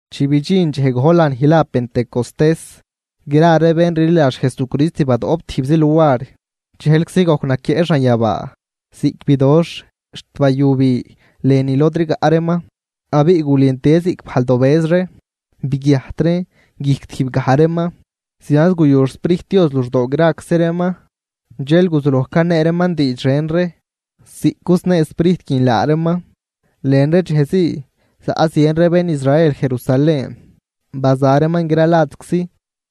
Chi bidxin dxej gojl lanij la Pentecostés, gra ree bén rliladx Jesucrist badoꞌp tijbzi luar. Dxejlczi gojc naquieꞌ xanyabaa ziꞌc bidoxh xt bayu bi lënü lod rigaꞌ reeman, abiꞌ gulentie ziꞌc bajl dobëz ree, biguiajt reen guijc tijb gaj reeman. Zianz guyu xSprijt Dios luxdoo graczi reeman, dxel guzuloj canee reeman diidx ren ree ziꞌc cusnee Sprijt guin laa reeman. Lën ree dxej zii zaꞌ zien ree bén Israel Jerusalén, baza reeman gra ladczi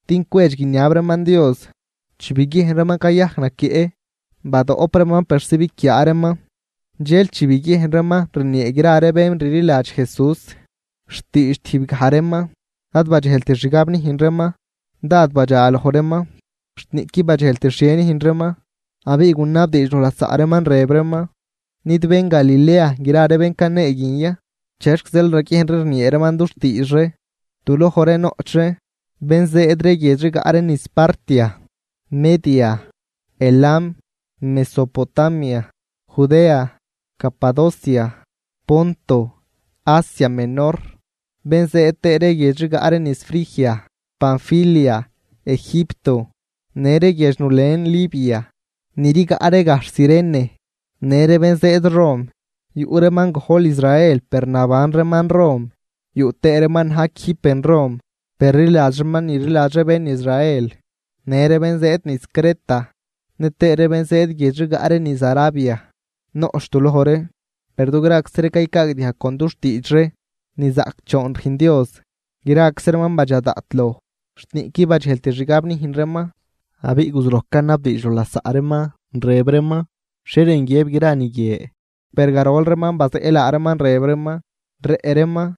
din cwedx guiniab reeman Dios. Chi biguiejn reeman cayajc naquieꞌ, badoꞌp reeman persi biquiaa reeman. Dxel chi biguiejn reeman rniee gra ree bén rliladx Jesús xtiidx tijb gaj reeman, ad badxejlt xgab nüjn reeman. Dád badxa loj reeman xt niꞌquid badxejlt xhie nüjn reeman, abiꞌ gunabdiidx loj lasaꞌ reeman rëb reeman: ―¿Nid bén Galilea gra ree bén canee guin ya? ¿Chexc zeel raguiejn ree rniee reeman dux tiidx ree? Du loj ree noꞌch ree bén zëëd guiedx rigaꞌ ree niz Partia, Media, Elam, Mesopotamia, Judea, Capadocia, Ponto, Asia Menor, bén zëëd tëë ree guiedx rigaꞌ ree niz Frigia, Panfilia, Egipto, në ree guiedx nulen Libia ni rigaꞌ ree gajxh Cirene, në ree bén zëëd Rom, yuꞌ reeman gojl Israel per naban reeman Rom, yuꞌ tëë reeman na̱j quijb ben Rom per rliladx reeman ni rliladx ree bén Israel. Në ree bén zëëd niz Creta nëtëë ree bén zëëd guiedx rigaꞌ ree niz Arabia noꞌch du loj ree. ¡Per dugraczi ree caycaagdiajg con dux tiidx ree nizaꞌcdxoon rüjn Dios! Graczi reeman badxa daꞌt loj xt niꞌquid badxejlt xgab nüjn reeman, abiꞌ guzuloj canabdiidx loj lasaꞌ reeman rëb reeman: ―¿Xhie rën guiëb gra ni guie? Per garol reeman bazeꞌ laa reeman, rëb reeman: ―Rëꞌ reeman.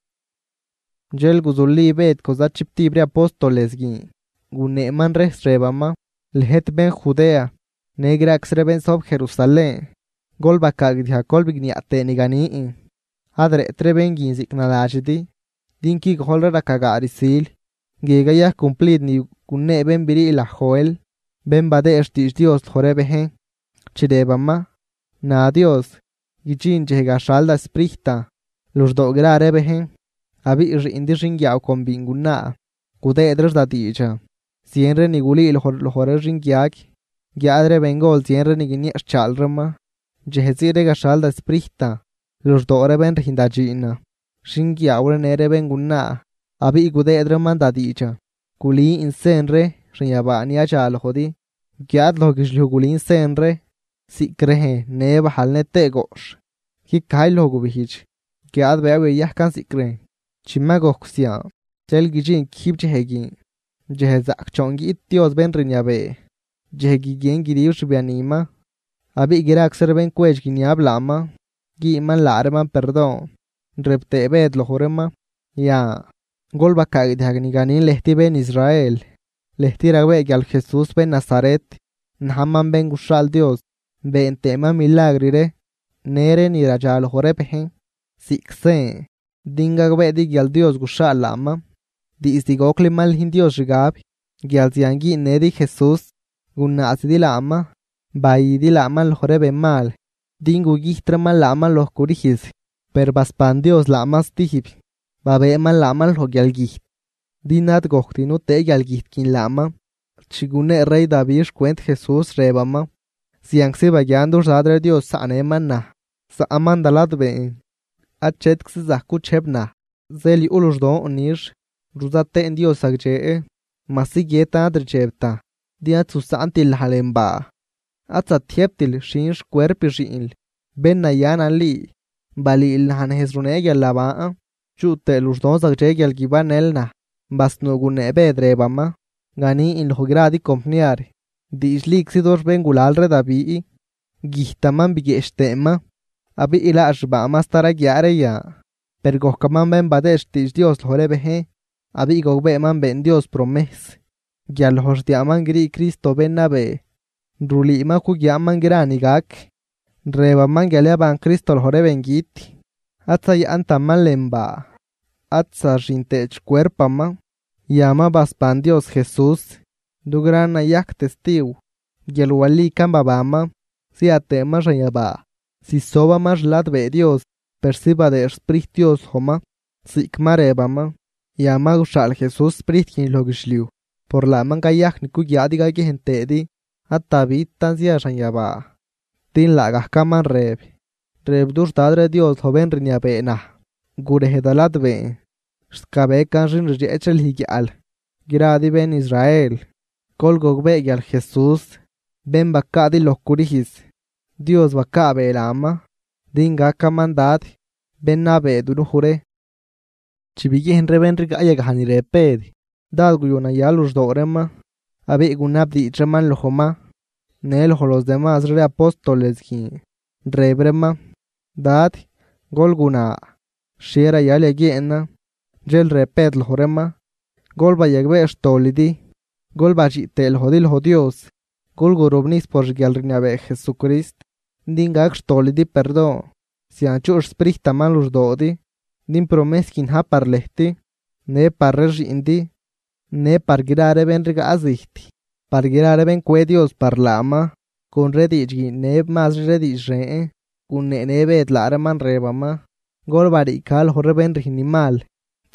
Dxel guzuli Bëd con zachibtib ree apóstoles guin, guneeman rejs rëbaman: ―Lëjt bén Judea në graczi ree bén zojb Jerusalén, gol bacaagdiajg gol bigniaꞌ tëë ni ganin. Ad rëꞌt ree bén guin ziꞌc naladxidi, din qui gojlri raca gaa rsil. Guie cayajc cumplid ni gunee bén brii laj Joel, bén badëë xtiidx Dios loj ree bejn, chi rëbaman: Na Dios, guidxin dxej gaxhal da Sprijtan luxdoo gra ree bejn, abiꞌ xiꞌndi xinguiaaw con biingunaa gudëëd reex da diidxan, zien ree ni gulüüloj loj ree xinguiag, guiáad ree bengol zien ree ni guinieꞌxchaal reeman. Dxej zii ree gaxhal da Sprijtan luxdoo ree bén rüjn da dxiinan, xinguiaaw ree në ree béngunaa, abiꞌ gudëëd reeman da diidxan. Gulün sen ree xanyabaa ni yadxa lojdi, guiáad loj guidxliuj gulün sen ree ziꞌc rejn në bajl nëtëë goꞌxh. Guicajy loj gubijdx, guiáad bëëw yayajcan ziꞌc rejn. Chi ma gojc zian, dxel guidxin quijb dxej guin, dxej zaꞌcdxoon guiꞌt Dios bén rniabee, dxej guiguien guidib xbianiman. Abiꞌ graczi ree bén cwedx guiniab laaman güünman laa reeman perdon. Rëb tëë Bëd loj reeman: ―Yan, gol bacaagdiajg ni ganin lëjt bén Israel: Lëjt ragbee guial Jesús bén Nazaret najman bén guxhaal Dios, been tëëman milagr ree në ree ni radxa loj ree bejn ziꞌc sen din gagbeedi guial Dios guxhaal laaman. Diizd gocli mal nüjn Dios xgab guial zian güünnëdi Jesús, gunaazidi laaman bayüdi laaman loj ree benmal, din gugüjt reeman laaman loj crüjz. Per basban Dios laaman stijb, babëëman laaman loj guialgüjt, din ad gojct nutëë guialgüjt guin laaman. Chi gunee rey Davi xcwent Jesús, rëbaman: Zianczi baguian dux Dad ree Dios zaꞌnëman naj. Zaꞌman da ladbeen, achetczi zajc guchejb naj. Zeel yuꞌ luxdon nix, ruzat tëën Dios zagdxe. majsi guiëtan ad rdxebtan, din ad zusaꞌntil naj lën baa, ad zatiëjbtil xhin xcuerp xiꞌnl bén naya nali. Balüül naj nejz runee guialnaban, chuꞌ tëë luxdon zagdxe guial guibannël naj. Basnuu gunee Bëd, rëbaman: ―Ganin loj gradi compniar, diidxliczi dux béngulal ree Davi güjtaman biguieꞌch tëëman, abiꞌ laa xbaaman sta raguiaa ree yan. Per gojcaman bén badëë xtiidx Dios loj ree bejn, abiꞌ gogbeeman been Dios promejs guial loj xdiaaman grii Cristo bén nabee. Rulüü ma cuguiaaman gra ni gac, rëbaman guial yaban Cristo loj ree bengüt, ad zayaꞌntaman lën baa ad zaxin tëët xcuerpaman. Yan ma basban Dios Jesús, dugran nayajc testiw guial walican babanman. Zia tëëman xanyabaa zisobaman xladbee Dios, persi badëë xSprijt Dios lojman ziꞌc ma rëbaman, yan ma guxhaal Jesús Sprijt guin loj guidxliuj, por laaman cayajc ni cuguiaadi caguiejn tëëdi. Ad Davitan zia xanyabaa, din laagajcaman rëb: Rëb dux Dad ree Dios loj bén rniabee naj: “Gurej da ladbeen, xt gabecan xin rdxeꞌch ree lüj guiaꞌl.” ’Gradi bén Israel gol gogbee guial Jesús bén bacaadi loj crüjz, Dios bacaabee laaman din gacaman Dad, bén nabee dunuj ree. Chi biguiejn ree bén rigaꞌ yagaj ni rëb Bëd, dád guyu naya luxdoo reeman. Abiꞌ gunabdiidx reeman lojman në loj los demazri ree apóstoles guin, rëb reeman: ―Dad, gol guna, ¿xhie rayal yaguieenan? Dxel rëb Bëd loj reeman: ―Gol bayagbee xtolidi, gol badxiꞌ tëë lojdi loj Dios, gol gurobnijs por xguialrniabee Jesucrist din gac xtolidi perdon, zian chuꞌ xSprijtaman luxdoodi. Din promejs guin na̱j par lëjt në par ree xiꞌndi në par gra ree bén rigaꞌ zijt, par gra ree bén cwe Dios par laaman. Con ree diidx guie në mazri ree diidx ren guneenë Bëd laa reeman, rëbaman: ―¡Gol bariica loj ree bén rüjn ni mal!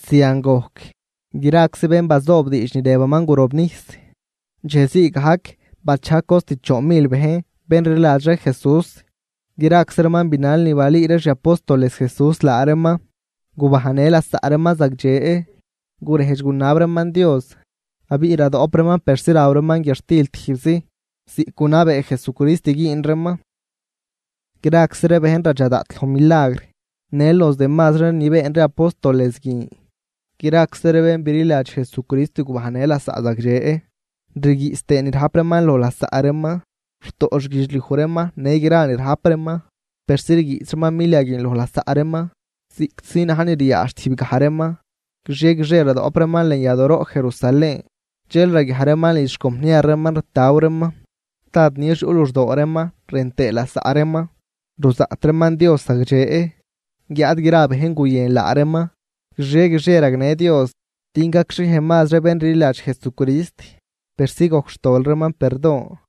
Zian gojc, graczi bén bazoob diidx ni rëbaman gurobnijs. Dxej zii gajc bachajg cost choon mil bejn bén rliladx ree Jesús. Graczi reeman binal ni balüü ree xi apóstoles Jesús laa reeman, gubajnnë lasaꞌ reeman zagdxe, gurejdx gunab reeman Dios abiꞌ radoꞌp reeman persi raw reeman guiadxtil tijbzi ziꞌc gunabee Jesucrist güün reeman. Graczi ree bejn radxa daꞌt loj milagr në los demazri ree ni been ree apóstoles guin. Graczi ree bén bililadx Jesucrist gubajnnë lasaꞌ zagdxe, rguiꞌs tëë ni rajp reeman loj lasaꞌ reeman. Rutoꞌ xguidxliuj reeman në gra ni rajp reeman, persi rguiꞌs reeman milia guin loj lasaꞌ reeman ziꞌctzi na̱j ni riaadx tijb gaj reeman. Guixie guixie radoꞌp reeman lën yadooroꞌ Jerusalén, dxel raguiaj reeman lidx xcompniar reeman rtaw reeman, dád nix yuꞌ luxdoo reeman rën tëë lasaꞌ reeman, ruzaꞌt reeman Dios zagdxe, guiáad gra bejn guyën laa reeman. Guixie guixie ragnë Dios din gacxhiej mazri bén rliladx Jesucrist, persi gojc xtol reeman perdon.